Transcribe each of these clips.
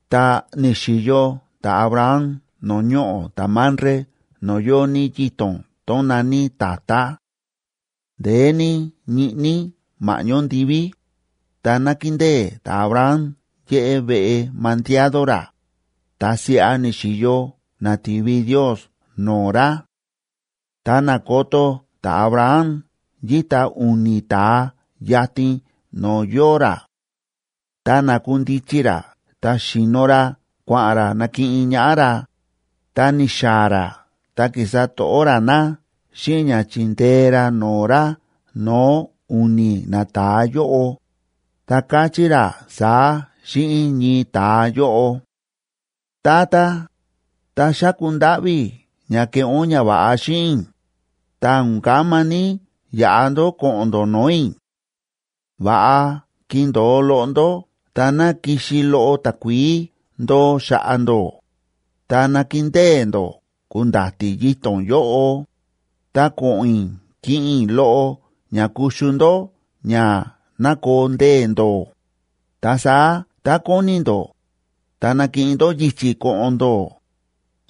Ta ni̱xi̱yo ta̱Abraham no̱o̱ ñoꞌo̱ ta̱Mamre no̱o̱ yóo ní yito̱n tón na̱ní tatá. Ndeé ní ñiꞌní ma̱ꞌñó ndiví, ta nákindée ta̱Abraham yéꞌé veꞌe mandiado ra, ta siꞌa ni̱xi̱yo na̱ti̱vi Ndiosa no̱o̱ ra. Ta na̱koto ta̱Abraham yíta u̱ni̱ ta̱a yatin no̱o̱ yóo ra. Ta na̱kundichi ra ta xi̱no ra kua̱ꞌa̱n ra nakiꞌin ñaꞌá ra, ta ni̱xaa̱ ra ta ki̱sa to̱ꞌó ra na xíꞌin ña chi̱ndee ra no̱o̱ ra no̱o̱ u̱ni̱ nata̱a yóꞌo, ta káchí ra saá xíꞌin ñii ta̱a yóꞌo: ―Tata, ta xáku ndáꞌví i̱ ña keꞌé ún ñava̱ꞌa xíꞌin i̱, ta o̱n kama ní yaꞌa ndó ko̱ꞌo̱n ndó no̱o̱ i̱. Va̱ꞌa kindo̱o loꞌo ndó ta ná kixi loꞌo takuií ndoo xa̱ꞌa̱ ndó, ta nakindée ndó ku̱nda̱ti̱ yito̱n yóꞌo, ta ko̱ꞌo̱n i̱ kiꞌin i̱ loꞌo ña kuxu ndó ña ná koo ndee̱ ndó, ta saá tá kóni ndó, ta nakiꞌin ndó yichi̱ ko̱ꞌo̱n ndó,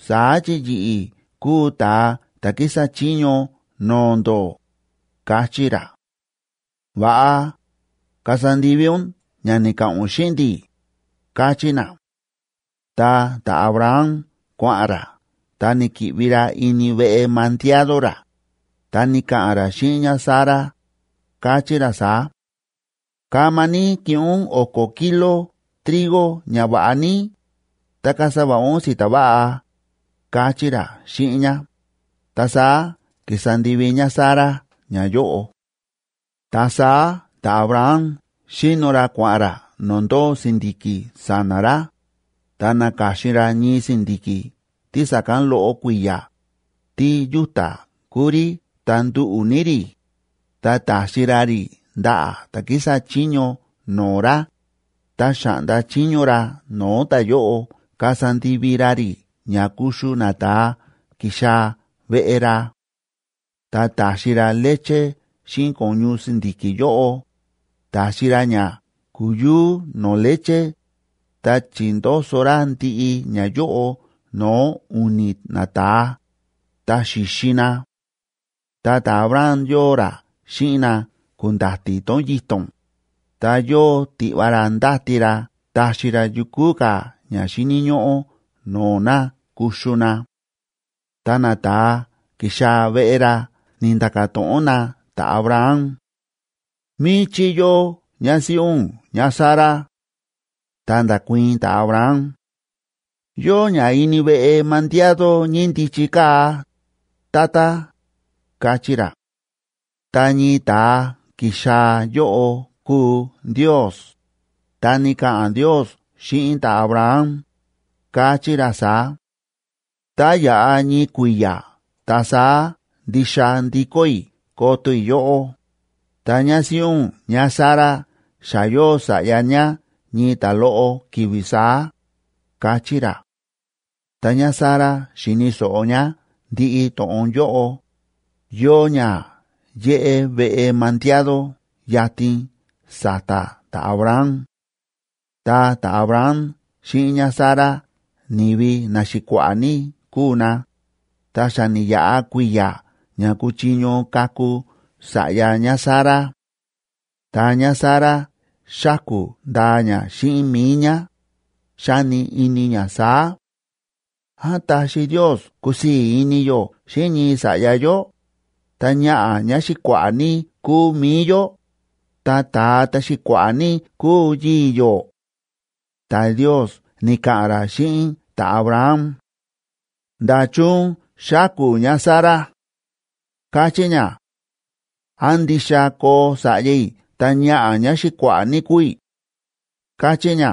saá chi yi̱ꞌi̱ kúu ta̱a ta̱ kísa chiño no̱o̱ ndó ―káchí ra. ―Va̱ꞌa, kasa ndivi ún ña ni̱ka̱ꞌa̱n ún xíꞌin ndi̱ ―káchí na. Ta ta̱Abraham kua̱ꞌa̱n ra ta ni̱ki̱ꞌvi ra ini veꞌe mandiado ra, ta ni̱ka̱ꞌa̱n ra xíꞌin ñáSara, káchí ra saá: ―Kama ní kiꞌin ún o̱ko̱ kilob trigo ña va̱ꞌa ní, ta kasa va̱ꞌa ún si̱ta̱ va̱ꞌa ―káchí ra xíꞌin ñá, ta saá ki̱sa ndivi ñáSara ñayóꞌo. Ta saá ta̱Abraham xi̱no ra kua̱ꞌa̱n ra no̱o̱ ndóo si̱ndi̱ki̱ sa̱na̱ ra, ta na̱ka̱xin ra ñii si̱ndi̱ki̱ tí sa̱kán loꞌo kui̱ya̱, tí yúta̱ kúu rí ta nduꞌu̱ ní rí, ta ta̱xi ra rí ndaꞌa̱ ta̱ kísa chiño no̱o̱ ra, ta xa̱ꞌnda chiño ra no̱o̱ ta̱yóꞌo kasa ndivi ra rí ña kuxu nata̱a ki̱xaa̱ veꞌe ra. Ta ta̱xi ra leche xíꞌin ko̱ñu si̱ndi̱ki̱ yóꞌo, ta̱xi ra ña ku̱yúú no̱o̱ leche, ta chi̱ndoso ra ndiꞌi ñayóꞌo no̱o̱ u̱ni̱ nata̱a, ta xi̱xi na. Ta ta̱Abraham yóo ra xíꞌin na ku̱nda̱ti̱ tón yito̱n, ta yóo tiꞌva ra ndáti ra taxi ra yukú ka̱ ña xíni̱ ñóꞌó no̱o̱ na kuxu na. Ta nata̱a ki̱xaa̱ veꞌe ra ni̱nda̱ka̱ to̱ꞌon na ta̱Abraham: ―¿Míchí yóo ñásíꞌí ún ñáSara? Ta nda̱kuii̱n ta̱Abraham: ―Yóo ñá ini veꞌe mandiado ñíndichi kaa̱, tata ―káchí ra. Ta ñii ta̱a ki̱xaa̱ yóꞌo kúu Ndios, ta ni̱ka̱ꞌa̱n Ndios xíꞌin ta̱Abraham, káchí ra saá: ―Tá yaꞌa ñii kui̱ya̱ ta saá ndixa ndikó i̱ koto i̱ yóꞌó, ta ñásíꞌí ún ñáSara xa yóo sa̱ꞌya ñá ñii ta̱loꞌo ki̱vi̱ saá ―káchí ra. Ta ñáSara xíni̱ so̱ꞌo ñá ndiꞌi to̱ꞌon yóꞌo, yóo ñá yéꞌé veꞌe mandiado yatin sa̱ta̱ ta̱Abraham. Ta ta̱Abraham xíꞌin ñáSara ni̱vi naxi̱kua̱ꞌa̱ ní kúu na, ta xa ni̱yaꞌa kui̱ya̱ ña ku̱chiño kaku sa̱ꞌya ñáSara. Ta ñáSara xáku̱ ndaa ñá xíꞌin mi̱i ñá, xáni ini ñá saá: “¿Án taxi Ndios kusii̱ ini yó xíꞌin ñii sa̱ꞌya yó, ta ñaꞌa̱ ñáxi̱kua̱ꞌa̱ ní kúu mi̱i yó, ta ta̱a ta̱xi̱kua̱ꞌa̱ ní kúu yii̱ yó?” Ta Ndios ni̱ka̱ꞌa̱n ra xíꞌin ta̱Abraham: ―¿Nda̱chun xáku̱ ñáSara?, káchí ñá: “¿Án ndixa koo sa̱ꞌya i̱ ta ñaꞌa̱ ñáxi̱kua̱ꞌa̱ ní kúu i̱?”, káchí ñá.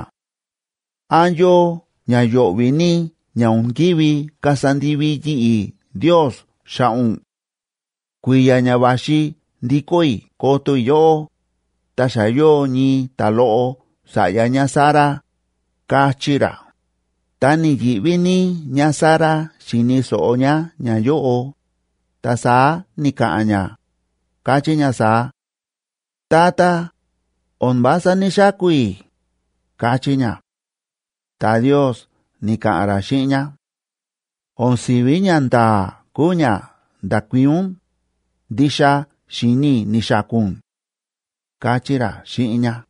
¿Án yóo ñayo̱ꞌvi̱ ní ña o̱n ki̱ví kasa ndivi yi̱ꞌi̱ Ndios xa̱ꞌa̱ ún? Kui̱ya̱ ña va̱xi ndikó i̱ koto i̱ yóꞌó, ta xa yóo ñii ta̱loꞌo sa̱ꞌya ñáSara ―káchí ra. Ta ni̱yi̱ꞌví ní ñáSara xi̱ni̱ so̱ꞌo ñá ñayóꞌo, ta saá ni̱ka̱ꞌa̱n ñá, káchí ñá saá: ―Tata, o̱n vása ní‑xaku̱ i̱ ―káchí ñá. Ta Ndios ni̱ka̱ꞌa̱n ra xíꞌin ñá: ―O̱n si̱ví ñanda̱a̱ kúu ña nda̱kuii̱n ún, ndixa xíni̱ i̱ ni̱xaku̱ ún ―káchí ra xíꞌin ñá.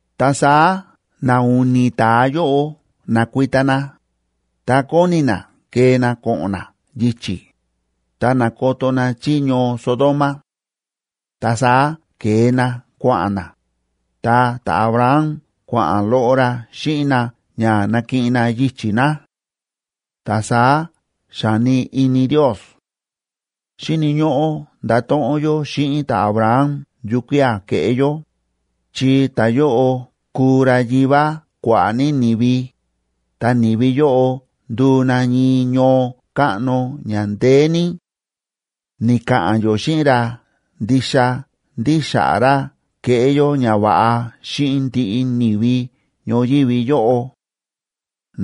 Ta saá na u̱ni̱ ta̱a yóꞌo na̱kuita na, ta kóni na kee na ko̱ꞌo̱n na yichi̱, ta na̱koto na chí ñoo Sodoma. Ta saá ke̱e na kua̱ꞌa̱n na, ta ta̱Abraham kua̱ꞌa̱n loꞌo ra xíꞌin na ña nakiꞌin na yichi̱ na. Ta saá xa̱ni ini Ndios: “Xíni̱ ñóꞌó ndato̱ꞌon yó xíꞌin ta̱Abraham yukía̱ keꞌé yó, chi ta̱yóꞌo kuu ra yivá kua̱ꞌa̱ ní ni̱vi, ta ni̱vi yóꞌo nduu na ñii ñoo káꞌno ña ndeé ní. Ni̱ka̱ꞌa̱n yó xíꞌin ra ndixa ndí xa̱ꞌa̱ ra keꞌé yó ñava̱ꞌa xíꞌin ndiꞌi ni̱vi ñoyívi yóꞌo.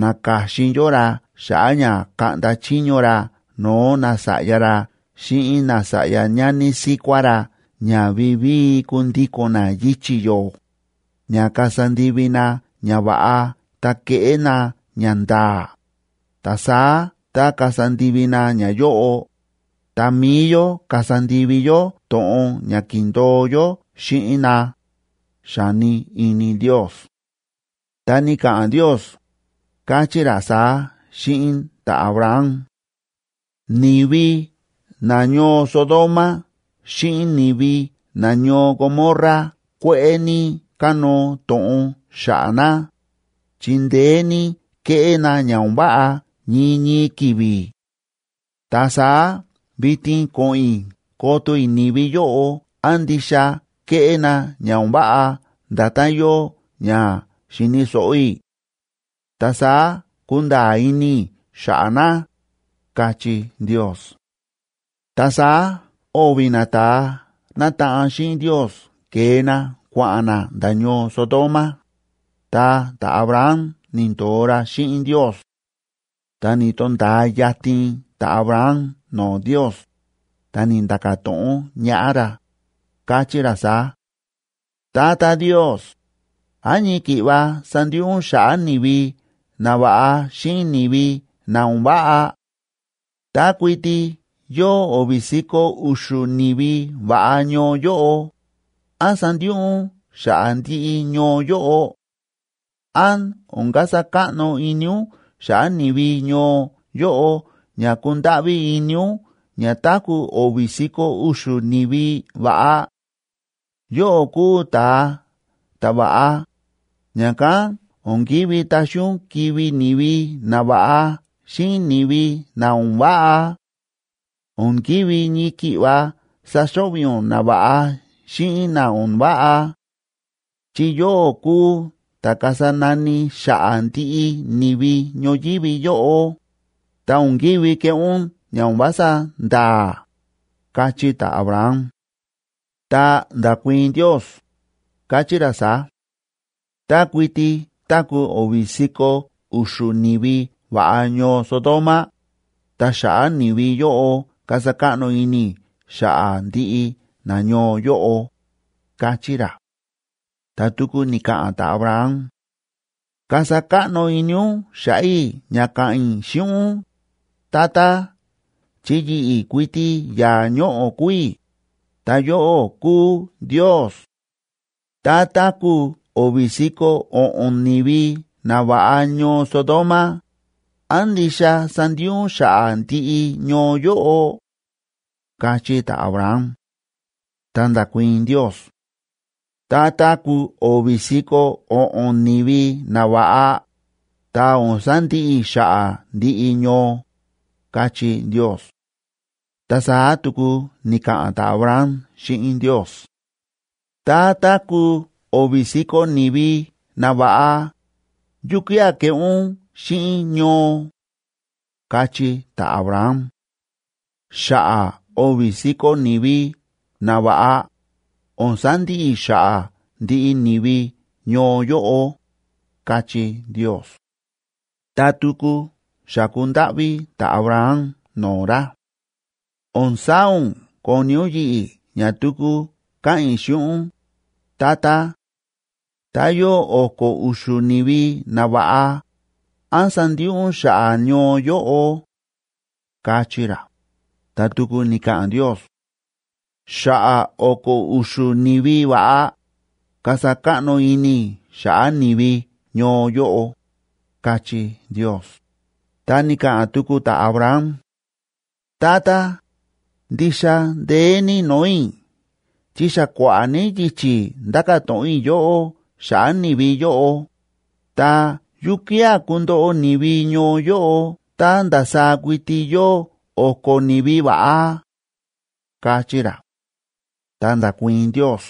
Na̱ka̱xin yó ra xa̱ꞌa̱ ña kaꞌnda chiño ra no̱o̱ nasa̱ꞌya ra xíꞌin nasa̱ꞌya ñani síkuá ra ña vivíi kundiko̱n na yichi̱ yó, ña kasa ndivi na ñava̱ꞌa ta keꞌé na ñanda̱a̱, ta saá tá kasa ndivi na ñayóꞌo, ta mi̱i yó kasa ndivi yó to̱ꞌon ña ki̱ndo̱o yó xíꞌin na”, xa̱ni ini Ndios. Ta ni̱ka̱ꞌa̱n Ndios, káchí ra saá xíꞌin ta̱Abraham: ―Ni̱vi nañoo Sodoma xíꞌin ni̱vi nañoo Gomorra kue̱ꞌe̱ ní kánóo to̱ꞌon xa̱ꞌa̱ na, chi ndeé ní kéꞌé na ña o̱n váꞌa ñii ñii ki̱vi̱. Ta saá vitin ko̱ꞌo̱n i̱ koto i̱ ni̱vi yóꞌo án ndixa ke̱ꞌé na ña o̱n váꞌa nda̱tán yóo ña xi̱ni̱ so̱ꞌo i̱. Ta saá kunda̱a̱ ini i̱ xa̱ꞌa̱ na ―káchí Ndios. Ta saá o̱vi̱ nata̱a nátaꞌan xíꞌin Ndios ke̱e na kua̱ꞌa̱n na nda̱ ñoo Sodoma, ta ta̱Abraham ni̱ndo̱o ra xíꞌin Ndios. Ta ni̱to̱nda̱a yatin ta̱Abraham no̱o̱ Ndios, ta ni̱nda̱ka̱ to̱ꞌon ñaꞌá ra, káchí ra saá: ―Tata Ndios, ¿án ñii ki̱ꞌva sandiꞌi ún xa̱ꞌa̱ ni̱vi na va̱ꞌa xíꞌin ni̱vi na o̱n váꞌa? Tá kuiti yóo o̱vi̱ si̱ko̱ u̱xu̱ ni̱vi va̱ꞌa ñoo yóꞌo, ¿án sandiꞌi ún xa̱ꞌa̱ ndiꞌi ñoo yóꞌo? ¿Án o̱n kasa káꞌno ini ún xa̱ꞌa̱ ni̱vi ñoo yóꞌo ña kúndáꞌví ini ún ña táku̱ o̱vi̱ si̱ko̱ u̱xu̱ ni̱vi va̱ꞌa? Yóꞌó kúu ta̱a ta̱va̱ꞌa, ña̱kán o̱n ki̱ví taxi ún kivi̱ ni̱vi na va̱ꞌa xíꞌin ni̱vi na o̱n váꞌa; o̱n ki̱ví ñii ki̱ꞌva saxo̱ꞌvi̱ ún na va̱ꞌa xíꞌin na o̱n váꞌa. Chi yóꞌó kúu ta̱ kasa nani xa̱ꞌa̱ ndiꞌi ni̱vi ñoyívi yóꞌo, ta o̱n ki̱ví keꞌé ún ña o̱n vása nda̱a̱ ―káchí ta̱Abraham. Ta nda̱kuii̱n Ndios, káchí ra saá: ―Tá kuiti táku̱ o̱vi̱ si̱ko̱ u̱xu̱ ni̱vi va̱ꞌa ñoo Sodoma, ta xa̱ꞌa̱ ni̱vi yóꞌo kasa káꞌno ini i̱ xa̱ꞌa̱ ndiꞌi nañoo yóꞌo ―káchí ra. Ta tuku ni̱ka̱ꞌa̱n ta̱Abraham: ―Kasa káꞌno ini ún xa̱ꞌa̱ i̱ ña káꞌa̱n i̱ xíꞌin ún, Tata, chi yi̱ꞌi̱ kuiti yaa̱ ñoꞌo̱ kúu i̱, ta yóꞌó kúu Ndios. Tá táku̱ o̱vi̱ si̱ko̱ o̱ꞌo̱n ni̱vi na va̱ꞌa ñoo Sodoma, ¿án ndixa sandiꞌi ún xa̱ꞌa̱ ndiꞌi ñoo yóꞌo? ―káchí ta̱Abraham. Ta nda̱kuii̱n Ndios: ―Tá táku̱ o̱vi̱ si̱ko̱ o̱ꞌo̱n ni̱vi na va̱ꞌa, ta o̱n sandiꞌi i̱ xa̱ꞌa̱ ndiꞌi ñoo ―káchí Ndios. Ta saá tuku ni̱ka̱ꞌa̱n ta̱Abraham xíꞌin Ndios: ―Tá táku̱ o̱vi̱ si̱ko̱ ni̱vi na va̱ꞌa, ¿yukía̱ keꞌé ún xíꞌin ñoo? ―káchí ta̱Abraham. ―Xa̱ꞌa̱ o̱vi̱ si̱ko̱ ni̱vi na va̱ꞌa, o̱n sandiꞌi i̱ xa̱ꞌa̱ ndiꞌi ni̱vi ñoo yóꞌo ―káchí Ndios. Ta tuku xa̱ku ndáꞌví ta̱Abraham no̱o̱ ra: ―O̱n saa̱ ún koni ún yi̱ꞌi̱ ña tuku káꞌa̱n i̱ xíꞌin ún, Tata. Tá yóo o̱ko̱ u̱xu̱ ni̱vi na va̱ꞌa, ¿án sandiꞌi ún xa̱ꞌa̱ ñoo yóꞌo? ―káchí ra. Ta tuku ni̱ka̱ꞌa̱n Ndios: ―Xa̱ꞌa̱ o̱ko̱ u̱xu̱ ni̱vi va̱ꞌa, kasa káꞌno ini i̱ xa̱ꞌa̱ ni̱vi ñoo yóꞌo ―káchí Ndios. Ta ni̱ka̱ꞌa̱n tuku ta̱Abraham: ―Tata, ndixa ndeé ní no̱o̱ i̱ chi xa kua̱ꞌa̱ ní yichi̱ ndáka̱ to̱ꞌon i̱ yóꞌó xa̱ꞌa̱ ni̱vi yóꞌo, ta, ¿yukía̱ kundoꞌo ni̱vi ñoo yóꞌo tá ndasaá kuiti yóo o̱ko̱ ni̱vi va̱ꞌa? ―káchí ra. Ta nda̱kuii̱n Ndios: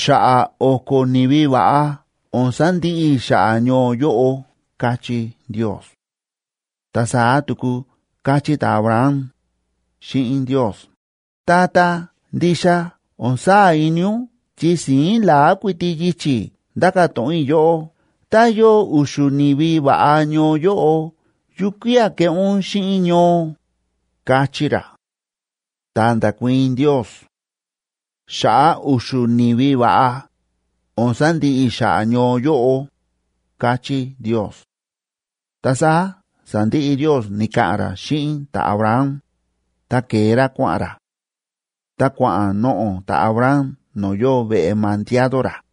―Xa̱ꞌa̱ o̱ko̱ ni̱vi va̱ꞌa, o̱n sandiꞌi i̱ xa̱ꞌa̱ ñoo yóꞌo ―káchí Ndios. Ta saá tuku káchí ta̱Abraham xíꞌin Ndios: ―Tata, ndixa o̱n saa̱ ini ún chi si̱ín la̱á kuiti yichi̱ ndáka̱ to̱ꞌon i̱ yóꞌó. Tá yóo u̱xu̱ ni̱vi va̱ꞌa ñoo yóꞌo, ¿yukía̱ keꞌé ún xíꞌin ñoo? ―káchí ra. Ta nda̱kuii̱n Ndios: ―Xa̱ꞌa̱ u̱xu̱ ni̱vi va̱ꞌa, o̱n sandiꞌi i̱ xa̱ꞌa̱ ñoo yóꞌo ―káchí Ndios. Ta saá sa̱ndiꞌi Ndios ni̱ka̱ꞌa̱n ra xíꞌin ta̱Abraham, ta ke̱e ra kua̱ꞌa̱n ra; ta kua̱ꞌa̱n noꞌo̱ ta̱Abraham no̱o̱ yóo veꞌe mandiado ra.